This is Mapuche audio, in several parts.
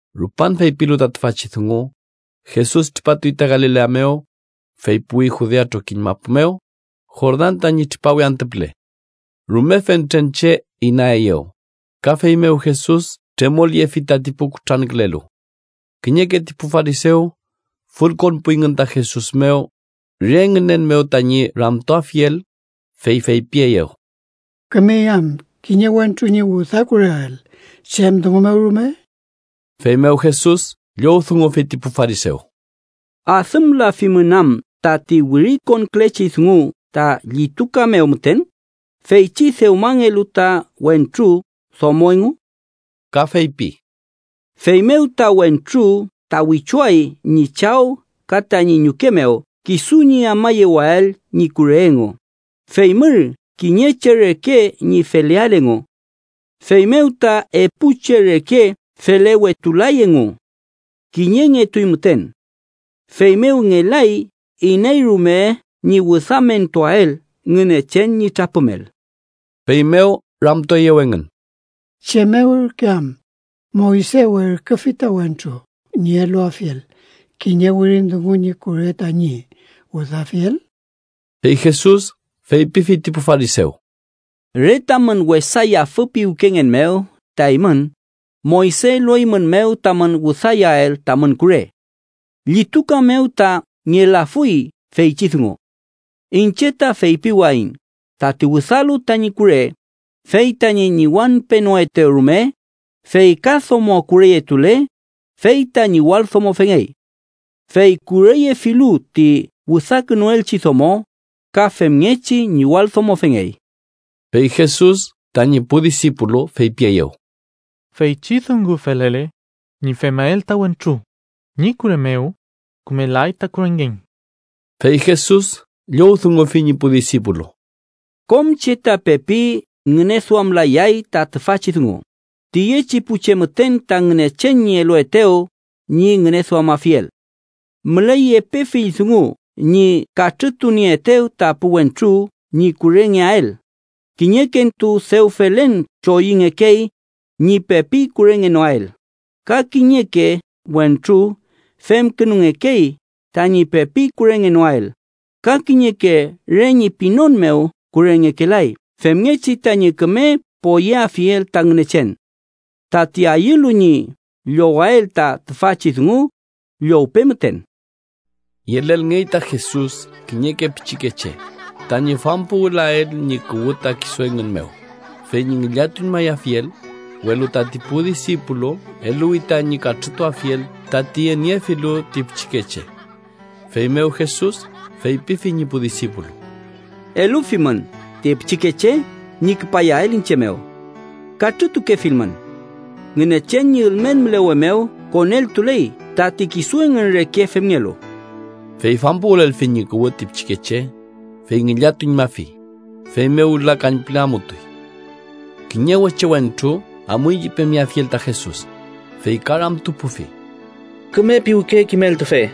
Rupan feypilu ta tüfachi dungu, Jesus tripatuy ta Galilea mew, fey puwi Judea trokiñ mapu mew, Jordan tañi tripawe antü püle. Rume fentren che inaeyew, ka feymew Jesus tremolyefi tati pu kutrankülelu. Kiñeke ti pu farisew fülkonpuyngün ta Jesus mew re ngünen mew tañi ramtuafiel, fey feypieyew: —¿Kümey am kiñe wentru ñi wüdakureael chem dungu mew rume? Feymew Jesus llowdungufi ti pu farisew: —¿Adümlafimün am tati wirikonkülechi dungu ta llituka mew müten, feychi dewmangelu ta wentru domo engu? Ka feypi: ‘Feymew ta wentru ta wichuay ñi chaw ka tañi ñuke mew kisu ñi amayewael ñi kure engu, fey mür kiñe che reke ñi feleael engu.’ Feymew ta epu che reke felewetulay engu. Kiñengetuy müten. Feymew ngelay iney rume ñi wüdamentuael Ngünechen ñi trapümel. Feymew ramtueyew engün: —¿Chem mew ürke am Moyse werküfi ta wentru ñi eluafiel kiñe wirin dungu ñi kure tañi wüdafiel? Fey Jesus feypifi ti pu farisew: —Re tamün wesa yafü piwkengen mew ta eymün, Moyse elueymünmew tamün wüdayael tamün kure. Llituka mew ta ngelafuy feychi dungu. Iñche ta feypiwayiñ tati wüdalu tañi kure fey tañi ñiwañpenoetew rume, fey ka domo kureyetule, fey ta ñiwaldomofengey. Fey kureyefilu ti wüdakünuelchi domo, ka femngechi ñiwaldomofengey. Fey Jesus tañi pu disipulu feypieyew: —Feychi dungu felele ñi femael ta wentru ñi kure mew, kümelay ta kurengen. Fey Jesus llowdungufi ñi pu disipulu: —Kom che ta pepi ngüneduamlayay ta tüfachi dungu, tiyechi pu che müten ta Ngünechen ñi eluetew ñi ngüneduamafiel. Müley epe fill dungu ñi katrütunieetew ta pu wentru ñi kurengeael: kiñekentu dew felen choyüngekey ñi pepi kurengenoael, ka kiñeke wentru femkünungekey tañi pepi kurengenoael, ka kiñeke re ñi pinon mew kurengekelay femngechi tañi küme poyeafiel ta Ngünechen. Tati ayülu ñi llowael ta tüfachi dungu, llowpe müten. Yelelngey ta Jesus kiñeke pichikeche, tañi fampuwülael ñi kuwü ta kisu engün mew, fey ñi ngillatuñmayafiel, welu tati pu disipulu eluwi tañi katrütuafiel tati yeniefilu ti pichikeche. Feymew Jesus feypifi ñi pu disipulu: —Elufimün ti pichikeche ñi küpayael iñche mew. Katrütukefilmün. Ngünechen ñi ülmen mülewe mew koneltuley tati kisu engün reke femngelu. Fey fampuwülelfi ñi kuwü ti pichikeche, fey ngillatuñmafi, feymew wüla kañpüle amutuy. Kiñe weche wentru amuy ñi pemeafiel ta Jesus, fey ka ramtupufi: —Küme piwke kimeltufe,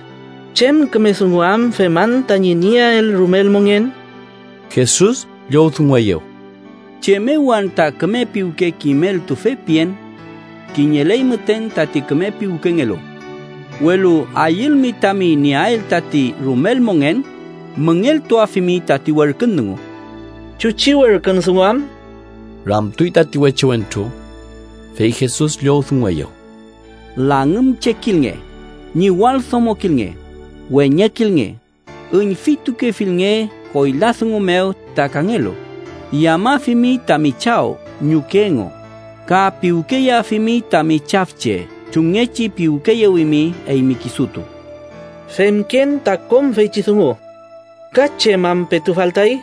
¿chem küme dungu am feman tañi nieael rumel mongen? Jesus llowdungueyew: —¿Chem mew anta küme piwke kimeltufe pien? Kiñeley müten tati küme piwkengelu. Welu ayülmi tami nieael tati rumel mongen, müngeltuafimi tati werkün dungu. —¿Chuchi werkün dungu am? ―ramtuy tati weche wentru. Fey Jesus llowdungueyew: —‘Langümchekilnge, ñiwaldomokilnge, weñekilnge, üñfitukefilnge koyla dungu mew ta kangelu, yamafimi tami chaw ñuke engu, ka piwkeyeafimi tami chafche chumngechi piwkeyewimi eymi kisutu.’ —Femken ta kom feychi dungu. ¿Ka chem am petu faltay?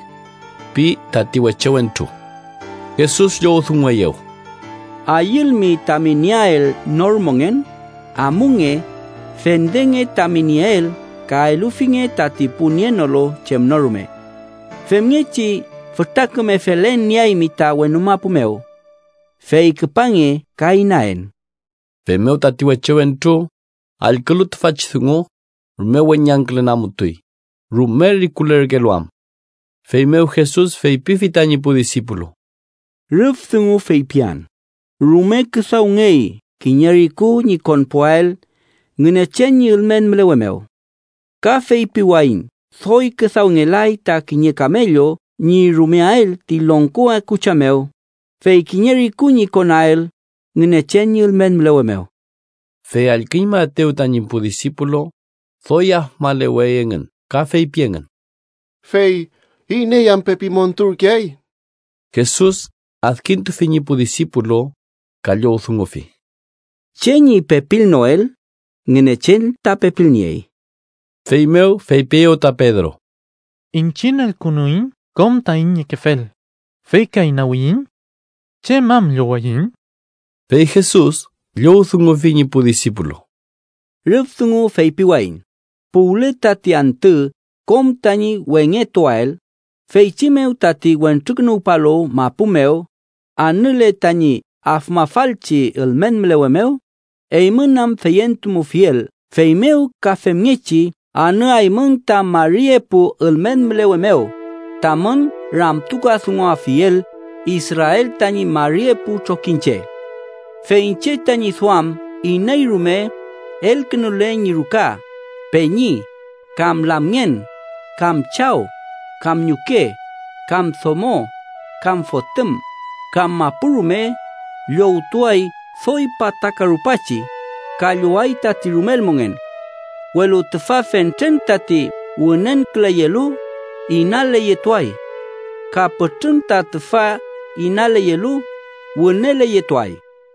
―pi tati weche wentru. Jesus llowdungueyew: —Ayülmi tami nieael nor mongen, amunge, fendenge tami nieel ka elufinge tati pu nienolu chem no rume. Femngechi fütra küme felen nieaymi ta wenu mapu mew. Fey küpange ka inaen. Feymew tati weche wentru, allkülu tüfachi dungu, rume weñangkülen amutuy, rume rikulerkelu am. Feymew Jesus feypifi tañi pu disipulu: —Rüf dungu feypian rume küdawngey kiñe riku ñi konpuael Ngünechen ñi ülmen mülewe mew. Ka feypiwayiñ doy küdawngelay ta kiñe kamellu ñi rumeael ti longko akucha mew, fey kiñe riku ñi konael Ngünechen ñi ülmen mülewe mew. Fey allküñmaetew tañi pu disipulu, doy afmalewey engün ka feypi engün: —Fey, ¿iney am pepi monturkeay? Jesus adkintufi ñi pu disipulu ka llowdungufi: —Che ñi pepilnoel, Ngünechen ta pepilniey. Feymew feypieyew ta Pedro: —Iñchiñ elkünuiñ kom taiñ niekefel fey ka inawiyiñ. ¿Chem am llowaiñ? Fey Jesus llowdungufi ñi pu disipulu: —Rüf dungu feypiwayiñ, puwle tati antü kom tañi wengetuael, feychi mew tati Wentrukünuwpalu mapu mew anüle tañi afmafalchi ülmen mülewe mew, eymün am feyentumufiel feymew ka femngechi anüaymün ta mari epu ülmen mülewe mew tamün ramtukadunguafiel Israel tañi mari epu trokiñche. Fey iñche tañi duam iney rume elkünule ñi ruka, peñi, kam lamngen, kam chaw, kam ñuke, kam domo, kam fotüm, kam mapu rume, llowtuay doy pataka rupachi, ka lloway tati rumel mongen. Welu tüfa fentren tati wünenküleyelu, inaleyetuay. Ka pütrün ta tüfa inaleyelu, wüneleyetuay.